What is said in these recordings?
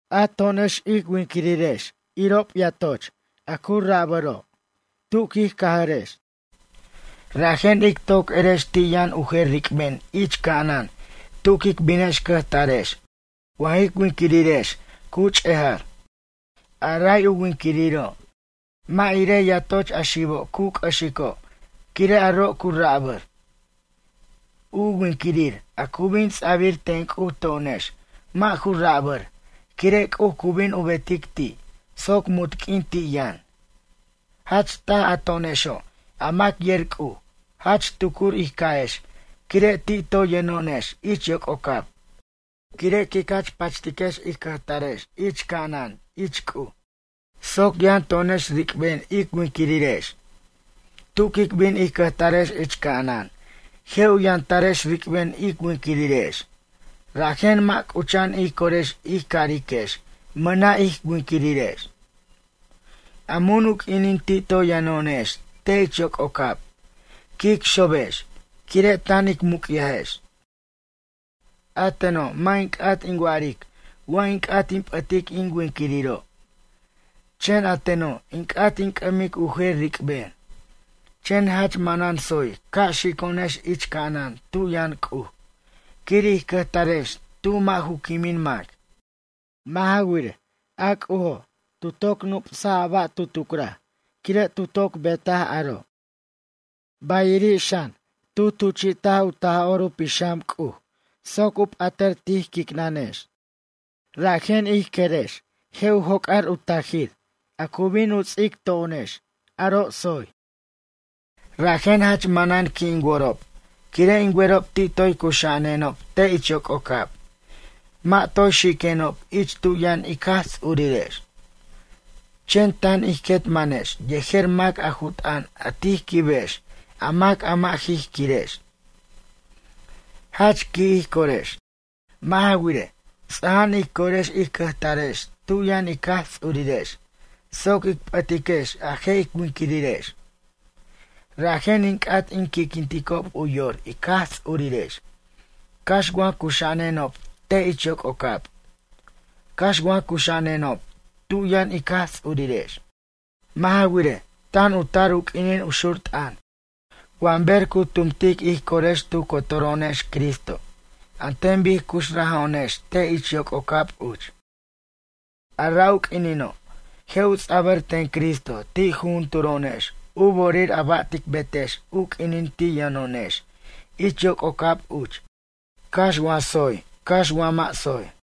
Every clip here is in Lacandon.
A to'onex ic winquirirex irob yatoch a ju rabʌrob tu quij cʌjarex. Rajen ic toc erex ti' yʌn u jer ric'ben ich ca'anan tu quic binex cʌjtarex wa jic winquirirex cu ch'ejar. A ray u winquiriro', mʌ' irej yatoch a xibo' cu c'ʌxico' quire' aro' cu rabʌr. U winquirir a cu bin ts'abir ten C'uj to'onex mʌ' ju rabʌr quire' C'uj cu bin u betic ti', soc munt q'uin ti' yʌn. Jach taj a to'onexo', a mac yer C'uj jach tucur ij ca'ex quire' ti' toy yʌno'onex ich yoc'ocab. Quire' quic jach pachtiquex ij cʌjtarex ich ca'anan ich C'uj soc yʌn to'onex ric'ben ic winquirirex. Tu quic bin ij cʌjtarex ich ca'anan, je' u yʌntarex ric'ben ic winquirirex, rajen mʌ' c'ucha'an ij corex ij cariquex mʌna' ij winquirirex. A mun u q'uinin ti' toy yʌno'onex te' ich yoc'ocab quic xobex quire' tan ic muc'yajex. A teno' mʌ' in c'at in wa'aric wa in c'at in p'ʌtic in winquiriro'. Chen a teno' in c'at in c'ʌmic u jer ric'ben. Chen jach manan tsoy ca' xico'onex ich ca'anan tu yʌn C'uj quir ij cʌjtarex tu mʌ' ju quimin mac. Mʌ' ja wirej, a C'ujo' tu toc nup'sa a ba' tu tucraj quire' tu toc bet aro'. Bayiri' xan, tu tuchi't u Taj'or u Pixam C'uj soc u p'atʌr tij quicnʌnex, rajen ij querex je' u joc'ar u tajir a cu bin u ts'ic to'onex aro' tsoy. Rajen jach manan qui' in worob quire' in werob ti' toy cuxa'anenob te' ich yoc'ocab mʌ' toy xiquenob ich tu yʌn ic Jaj Ts'urirex. Chen tan ij quet manex yejer mac a ju t'ʌn a tij quibex a mac a mʌ' ij quirex. Jach qui' ij corex. Mʌ' ja wirej, ts'aja'an ij corex ij cʌjtarex tu yʌn ic Jaj Ts'urirex soc ic p'ʌtiquex a je' ic winquirirex. Rajen in c'at in qui'quinticob u yor ic Jaj Ts'urirex, cax wa cuxa'anenob te' ich yoc'ocab, cax wa cuxa'anenob tu yʌn ic Jaj Ts'urirex. Mʌ' ja wirej, tan u tar u q'uinin u xur t'ʌn wa ber cu tumtic ij corex tu cotoro'onex Cristo an ten bic cuxraja'anonex te' ich yoc'ocab uch. A ra' u quinino' je' u ts'abʌr ten Cristo ti' jujunturo'onex u bo'orir a ba' tic betex u q'uinin ti' yʌno'onex ich yoc'ocab uch cax wa tsoy cax wa mʌ' tsoy.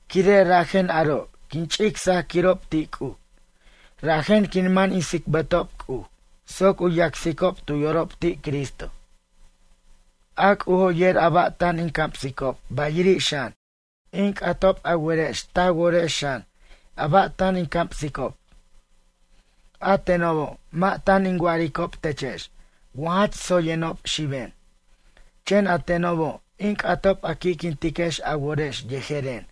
Quire' rajen aro' quin ch'ic sajquirob ti' C'uj, rajen quin man in tsicbatob C'uj soc u yacsicob tu yorob ti' Cristo. A C'ujo' yer a ba' tan in camsicob bayiri' xan, in c'atob a werex ta worex xan a ba' tan in camsicob. A tenobo' mʌ' tan in wa'aricob techex wa jach tsoyenob xiben, chen a tenobo' in c'atob a qui'quintiquex a worex yejeren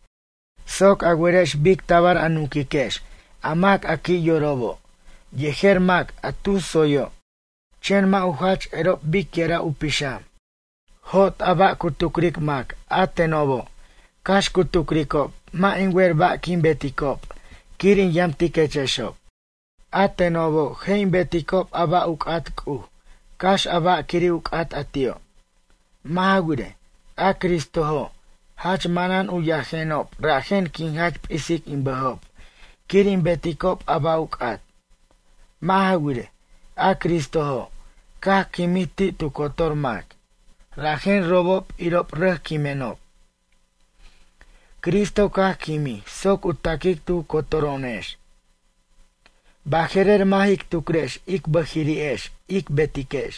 soc a werex bic tabar a nunquiquex a mac a qui' yorobo' yejer mac a tus tsoyo', chen mʌ' u jach erob biquira' u pixam. Jot a ba' cu tucric mac a tenobo', cax cu tucricob mʌ' in wer ba' quin beticob quir in yamtiquechexo'. A tenobo', je' in beticob a ba' u c'at C'uj cax a ba' quiri' u c'at a ti'o'. Mʌ' ja wirej, a Cristojo' jach manan u yajenob rajen quin jach p'isic in bʌjob quir in beticob a ba' u c'at. Mʌ' ja wirej, a Cristojo' caj quimij ti' tu cotor mac, rajen robob irob rʌc quimenob. Cristo caj quimij soc u taquic tu cotoro'onex. Baje'rer mʌ' jic tucrex ic bʌjiri'ex ic betiquex.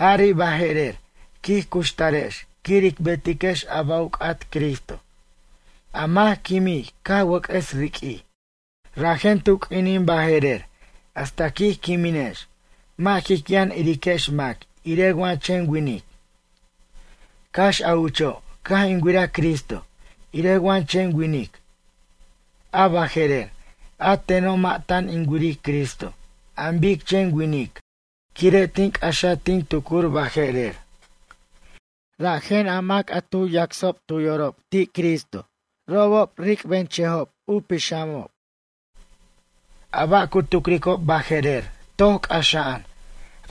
Jari' baje'rer quij cuxtarex quir ic betiquex a ba' u c'at Cristo, a mac quimij ca' wʌc'ʌs riq'uij. Rajen tu q'uinin baje'rer hasta quij quiminex mʌ' jic yʌn iriquex mac irej wa chen winic. Cax a ucho' caj in wiraj Cristo irej wa chen winic. A baje'rer a teno' mʌ' tan in wiric Cristo an bic chen winic quire' tin c'axaj tin tucur baje'rer. Rajen a mac a tu yacsob tu yorob ti' Cristo robob ric'benchʌjob u pixamob. A ba' cu tucricob baje'rer toc c'axa'an,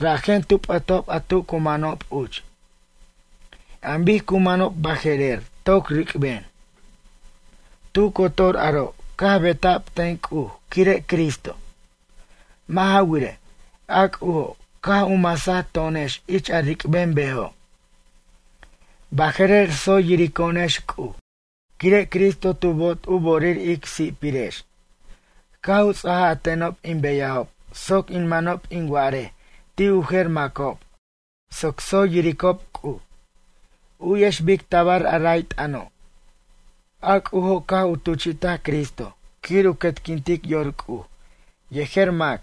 rajen tu p'ʌtob a tu cu manob uch. An bic cu manob baje'rer toc ric'ben. Tu cotor aro' caj beta'b ten C'uj quire' Cristo. Mʌ' ja wirej, a C'ujo' caj u masaj to'onex ich a ric'ben bejo'. Baje'rer tsoy yirico'onex C'uj quire' Cristo tu toc bo'ot u bo'orir ic si'pirex. Caj u ts'ajaj a tenob in beyajob soc in manob in wa'arej ti' u jer macob soc tsoy yiricob C'uj. U'yex bic tabar a ray t'ʌno'. A C'ujo' caj u tuchi'ta Cristo quir u quetquintic yor C'uj yejer mac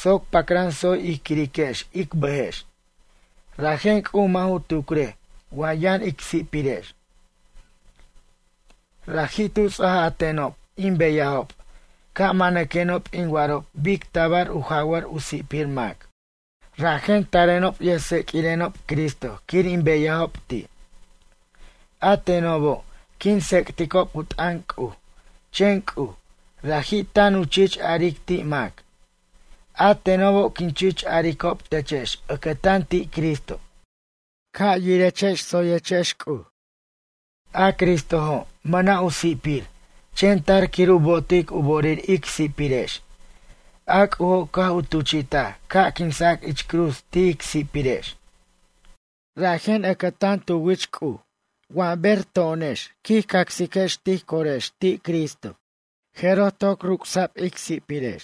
soc pacran tsoy ij quiriquex ic bʌjex, rajen C'uj mʌ' ju tucrej wa yʌn ic si'pirex. Raji' tu ts'ajaj a tenob in beyajob ca' manquenob in wa'arob bic tabar u jawar u si'pir mac. Rajen tarenob yʌjtseq'uirenob Cristo quir in beyajob ti'. A tenobo' quin tsec'ticob u t'ʌn C'uj, chen C'uj, raji' tan u chich aric ti' mac. A tenobo' quin chich aricob techex ʌcʌtan ti' Cristo: “Ca' yiriquechex tsoyechex C'uj.” A Cristojo' mʌna' u si'pir chen tar quir u bo'otic u bo'orir ic si'pirex, a C'ujo' caj u tuchi'taj ca' quinsa' ich cruz ti' ic si'pirex. Rajen ʌcʌtan tu wich C'uj wa ber to'onex quij cacsiquex tij corex ti' Cristo, jeroj toc ruc'sa'b ic si'pirex.